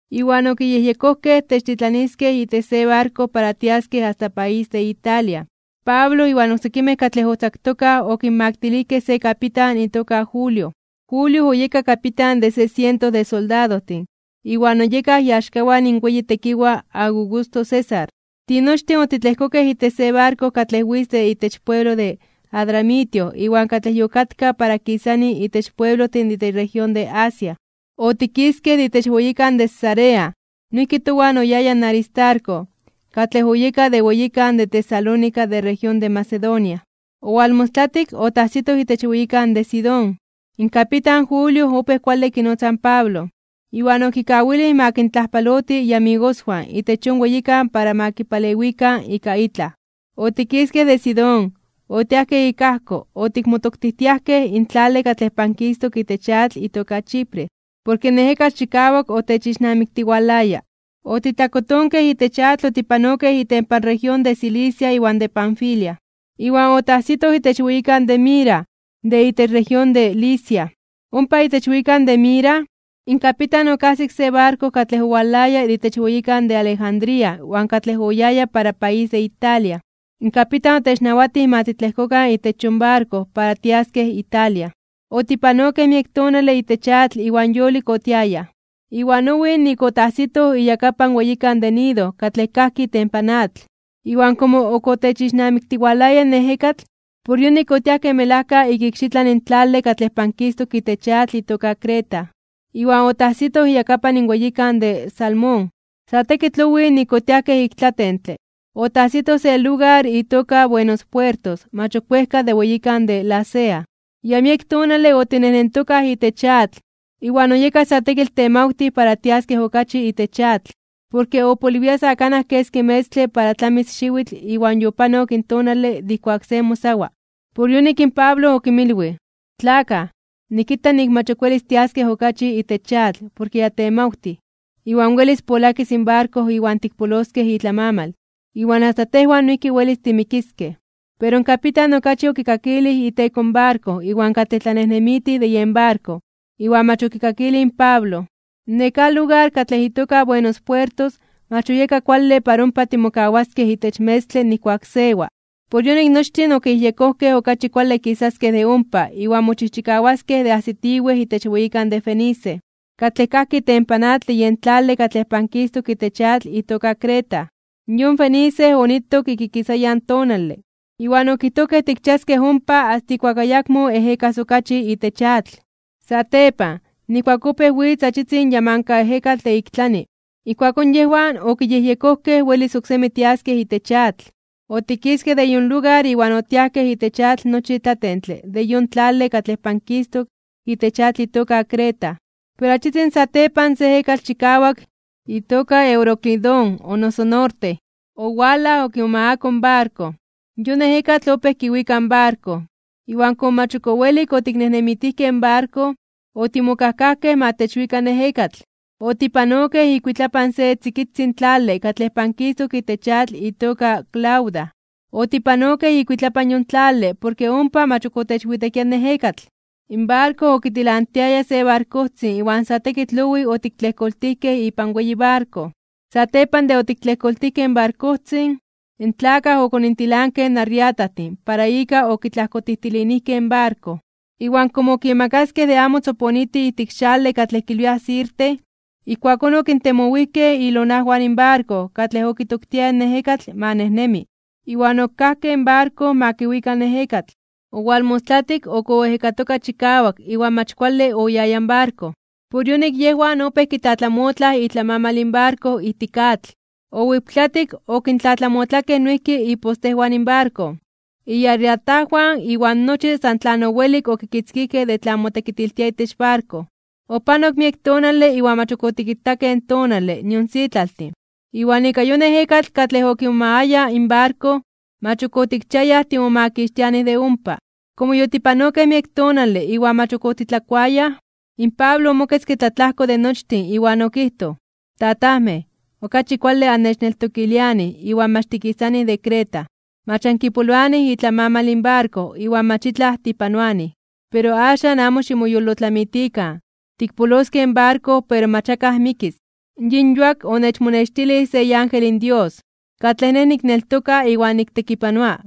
Iwan okiyejyekojkej techtitlaniskej itech se barko para tiaskej asta país de Italia. Pablo iwan oksekimej katlej otzaktokaj okinmaktilijkej se kapitan itoka Julio. Julio oyeka kapitan de se siento de soldadojtin iwan oyekaj iaxkawan in weyi tekiwaj Augusto César. Tinochtin otitlejkokej itech se barko katlej witz de itech pueblo de Adramitio iwan katlej yokatka para kisani itech pueblojtin de itech región de Asia. Otikiskej de itech weyikan de Cesarea. Noijki towan oyaya in Aristarco, katlej oyeka de weyikan de Tesalónica de región de Macedonia. Owalmostlatik, otajsitoj itech weyikan de Sidón. In kapitan Julio opéj kuale kinotza in Pablo, iwan okikawilij ma kintlajpaloti iamigoswan itech yon weyikan para ma kipalewikan ika itlaj. Otikiskej de Sidón, otiajkej ik ajko otikmotoktijtiajkej (itikmonetechtijtiajkej) in tlale katlej pankistok itech atl itoka Chipre, porke in ejekatl chikawak otechixnamiktiwalaya. Otitlakotonkej itech atl otipanokej itempan región de Cilicia iwan de Panfilia, iwan otajsitoj itech weyikan de Mira, de itech región de Licia. Ompa itech weyikan de Mira, in kapitan okajsik se barko katlej owalaya de itech weyikan de Alejandría iwan katlej oyaya para país de Italia. In kapitan otechnawatij ma titlejkokan itech yon barko para tiaskej Italia. Otipanokej miek tonale itech atl iwan yolik otiayaj, iwan owij nik otajsitoj iyakapan in weyikan de Gnido katlej kajki itempan atl. Iwan komo ok otechixnamiktiwalaya in ejekatl, por yonik otiajkej melajka ik ikxitlan in tlale katlej pankistok itech atl itoka Creta, iwan otajsitoj iyakapan in weyikan de Salmón. Sa tekitl owij nik otiajkej ik tlatentle. Otajsitoj se lugar itoka Buenos Puertos mach ok wejka de weyikan de Lasea. Ya miek tonale otinejnentokaj itech atl, iwan oyeka sa tekitl temawtij para tiaskej okachi itech atl, porke opoliwia sa kanaj keski metztle para tlamis xiwitl iwan yopanok in tonale de ijkuak se mosawa (ayunaroa). Por yonik in Pablo okinmilwij: ―Tlakaj, nikita nik mach ok welis tiaskej okachi itech atl porke ya temawtij, iwan welis polakis in barko iwan tikpoloskej itlamamal, iwan asta tejwan noijki welis timikiskej. Pero in kapitan okachi okikakilij iteko in barko iwan katlej tlanejnemitij de yen barko, iwan mach okikakilij in Pablo. Nekáj lugar katlej itoka Buenos Puertos mach oyeka kuale para ompa timokawaskej itech metzmej nijkuak sewa. Por yonik nochtin okiyejyekojkej okachi kuale kisaskej de ompa iwan mochijchikawaskej de ajsitiwej itech weyikan de Fenice, katlej kajki itempan atl de yen tlale katlej pankistok itech atl itoka Creta. Yon Fenice onitok ik ikisayan in tonale, iwan okijtojkej tikchiaskej ompa asta ijkuak ayakmo ejekas okachi itech atl. Satepan, nijkuak opéj witz achitzin yamankaejekatl de ik tlani, ijkuakón yejwan okiyejyekojkej welis oksemi tiaskej itech atl. Otikiskej de yon lugar iwan otiajkej itech atl nochi tlatentle de yon tlale katlej pankistok itech atl itoka Creta. Pero achitzin satepan se ejekatl chikawak itoka Euroclidón o noso Norte, owalaj okimomagako in barko. Yon ejekatl opéj kiwika in barko. Iwan komo mach ok owelik otiknejnemitijkej in barko, otimokajkajkej ma techwika in ejekatl. Otipanokej ikuitlapan se tzikitzin tlale katlej pankistok itech atl itoka Clauda. Otipanokej ikuitlapan yon tlale porke ompa mach ok otechwitekia in ejekatl. In barko okitilantiaya se barkojtzin iwan sa tekitl owij otiktlejkoltijkej ipan weyi barko. Satepan de otiktlejkoltijkej in barkojtzin, in tlakaj okonintilankej in arreatajtin para ika okitlajkotijtilinijkej in barko. Iwan komo okimakaskej de amo tzoponiti ijtik in xale katlej kilwiaj Sirte, ijkuakón okintemowijkej ilonajwan in barko katlej okitoktiaya in ejekatl ma nejnemi. Iwan okajkej in barko ma kiwika in ejekatl. Owalmostlatik, ok oejekatoka chikawak iwan mach kuale oyaya in barko. Por yonik yejwan opéj kitlatlamotlaj itlamamal in barko ijtik atl. Owiptlatik, okintlatlamotlakej noijki ipostejwan in barko, iarreatajwan iwan nochi san tlan owelik okitzkijkej de tlan motekitiltia itech barko. Opanok miek tonale iwan mach otikitakej in tonale nion sitlaltin, iwan ika yon ejekatl katlej okimomagaya in barko, mach ok otikchiayaj timomakixtianij de ompa. Komo yotipanokej miek tonale iwan mach otitlakuayaj, in Pablo omoketzke tlatlajko de nochtin iwan okijtoj: ―Tatajmej, okachi kuale annechneltokilianij iwan mach tikisanij de Creta. Mach ankipoloanij itlamamal in barko iwan mach itlaj tipanoanij. Pero axan amo ximoyolotlamitikan, tikpoloskej in barko pero mach akaj mikis. Yin yuak onechmonextilij se iángel in Dios, katlej nej nikneltoka iwan niktekipanoa.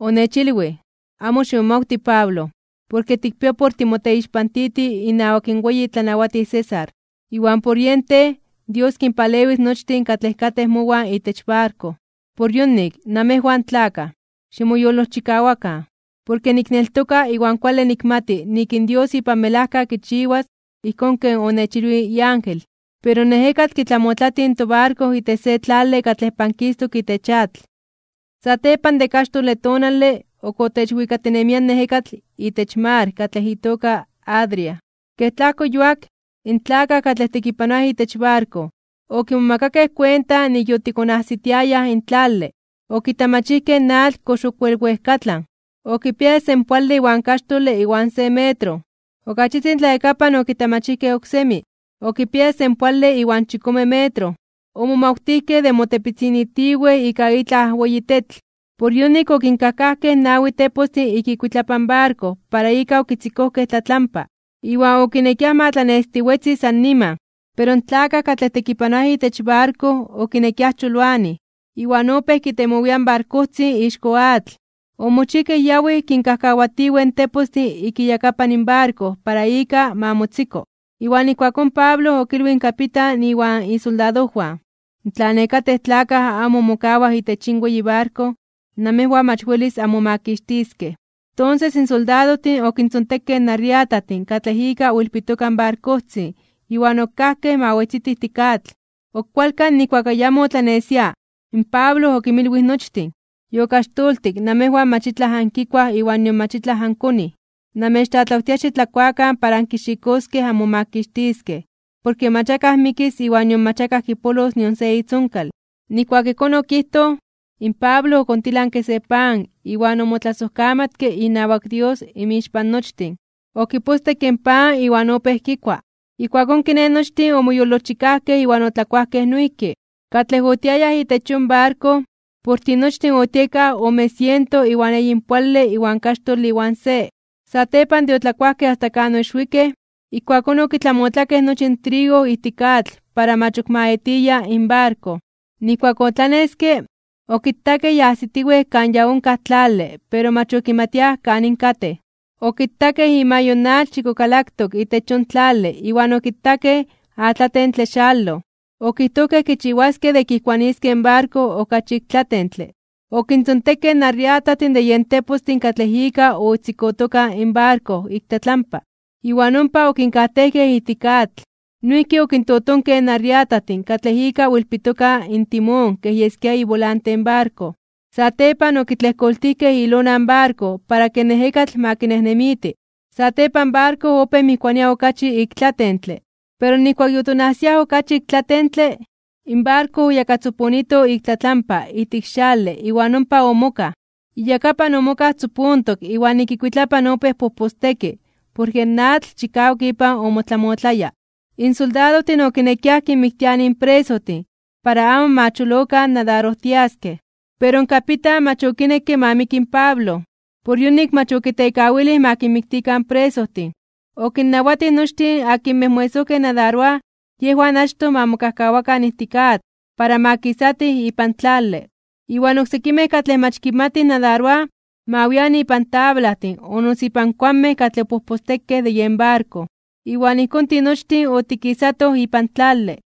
Onechilwij: “Amo ximomawti Pablo, porke tikpia por timoteixpantiti inawak in weyi tlanawatij César, iwan por yen tej Dios kinpalewis nochtin katlej katej mowan itech barko.” Por yonik, namejwan tlakaj, ximoyolojchikawakan, porke nikneltoka iwan kuale nikmati nik in Dios ipan melajka kichiwas ijkón ken onechilwij iángel. Pero in ejekatl kitlamotlati in tobarko itech se tlale katlej pankistok itech atl. Satepan de kaxtole tonale, ok otechwikatinemia in ejekatl itech mar katlej itoka Adria. Kej tlajko yuak, in tlakaj katlej tekipanoaj itech barko, okimomakakej kuenta nik yotikonajsitiayaj in tlale. Okitamachijkej in atl kox ok wel wejkatlan. Okipiaya senpoale iwan kaxtole iwan se metro. Ok achitzin tlayakapan okitamachijkej oksemi, okipiaya senpoale iwan chikome metro. Omomawtijkej de motepitzinitiwej (kimotoponilitiwej) ika itlaj weyi tetl. Por yonik okinkajkajkej nawi tepostin ik ikuitlapan in barko para ika okitzikojkej tlatlampa. Iwan okinekiaj ma tlanestiwetzi sa niman. Pero in tlakaj katlej tekipanoaj itech barko okinekiaj choloanij, iwan opéj kitemowiaj in barkojtzin ixko atl. Omochijkej yawij kinkajkawatiwej in tepostin ik iyakapan barko para ika ma motziko. Iwan ijkuakón in Pablo okilwij in kapitan iwan isoldadojwan: ―Tla nekatej tlakaj amo mokawaj itech yin weyi barko, namejwan mach welis anmomakixtiskej. Tonses in soldadojtin okintzontekej in arreatajtin katlej ika oilpitoka in barkojtzin iwan okajkej ma wetziti ijtik atl. Ok kualkan nijkuak ayamo otlanesia, in Pablo okinmilwij nochtin: ―Yokaxtoltik namejwan mach itlaj ankikuaj iwan nion mach ankochij. Namechtlatlawtia xitlakuakan para ankixikoskej anmomakixtiskej, porke mach akaj mikis iwan nion mach akaj kipolos nion se itzonkal. Nijkuak ijkón okijtoj, in Pablo okontilanke se pan iwan omotlasojkamatke inawak Dios inmixpan nochtin. Okipostekke in pan iwan opéj kikua. Ijkuakón kiné nochtin omoyolojchikajkej iwan otlakuajkej noijki. Katlej otiayaj itech yon barko, por tinochtin otiekaj ome siento iwan eyinpoale iwan kaxtole iwan se. Satepan de otlakuajkej asta kan oixwikej, ijkuakón okitlamotlakej nochi in trigo ijtik atl para mach ok ma etiya in barko. Nijkuak otlaneske, okitakej ya ajsitiwej kan ya onkaj tlale pero mach okimatiaj kanin katej. Okitakej imayo in atl chikokalaktok itech yon tlale iwan okitakej in atlatentle xaloj. Okijtojkej kichiwaskej de kijkuaniskej in barko okachi ik tlatentle. Okintzontekej in arreatajtin de yen tepostin katlej ika otzikotoka in barko ik tlatlampa, iwan ompa okinkajtejkej ijtik atl. Noijki okintotonkej in arreatajtin katlej ika oilpitoka in timón kej yeskia ibolante in barko. Satepan okitlejkoltijkej ilona in barko para ke in ejekatl ma kinejnemiti. Satepan in barko opéj mijkuania okachi ik tlatentle. Pero nijkuak yotonajsiaj okachi ik tlatentle, in barko oyakatzoponito ik tlatlampa ijtik xale iwan ompa omokaj. Iyakapan omokaj tzopontok iwan ik ikuitlapan opéj pojposteki porke in atl chikawak ipan omotlamotlaya. In soldadojtin okinekiaj kinmiktianij in presojtin para amo ma cholokan nadarojtiaskej. Pero in kapitan mach okinekke ma miki in Pablo. Por yonik mach okitekawilij ma kinmiktikan in presojtin. Okinnawatij nochtin akinmej moesojkej nadaroaj yejwan achtoj ma mokajkawakan ijtik atl para ma kisatij ipan tlale. Iwan oksekimej katlej mach kimatij nadaroaj ma wian ipan tablajtin o noso ipan kuanmej katlej opojpostekej de yen barko. Iwan ijkón tinochtin otikisatoj ipan tlale.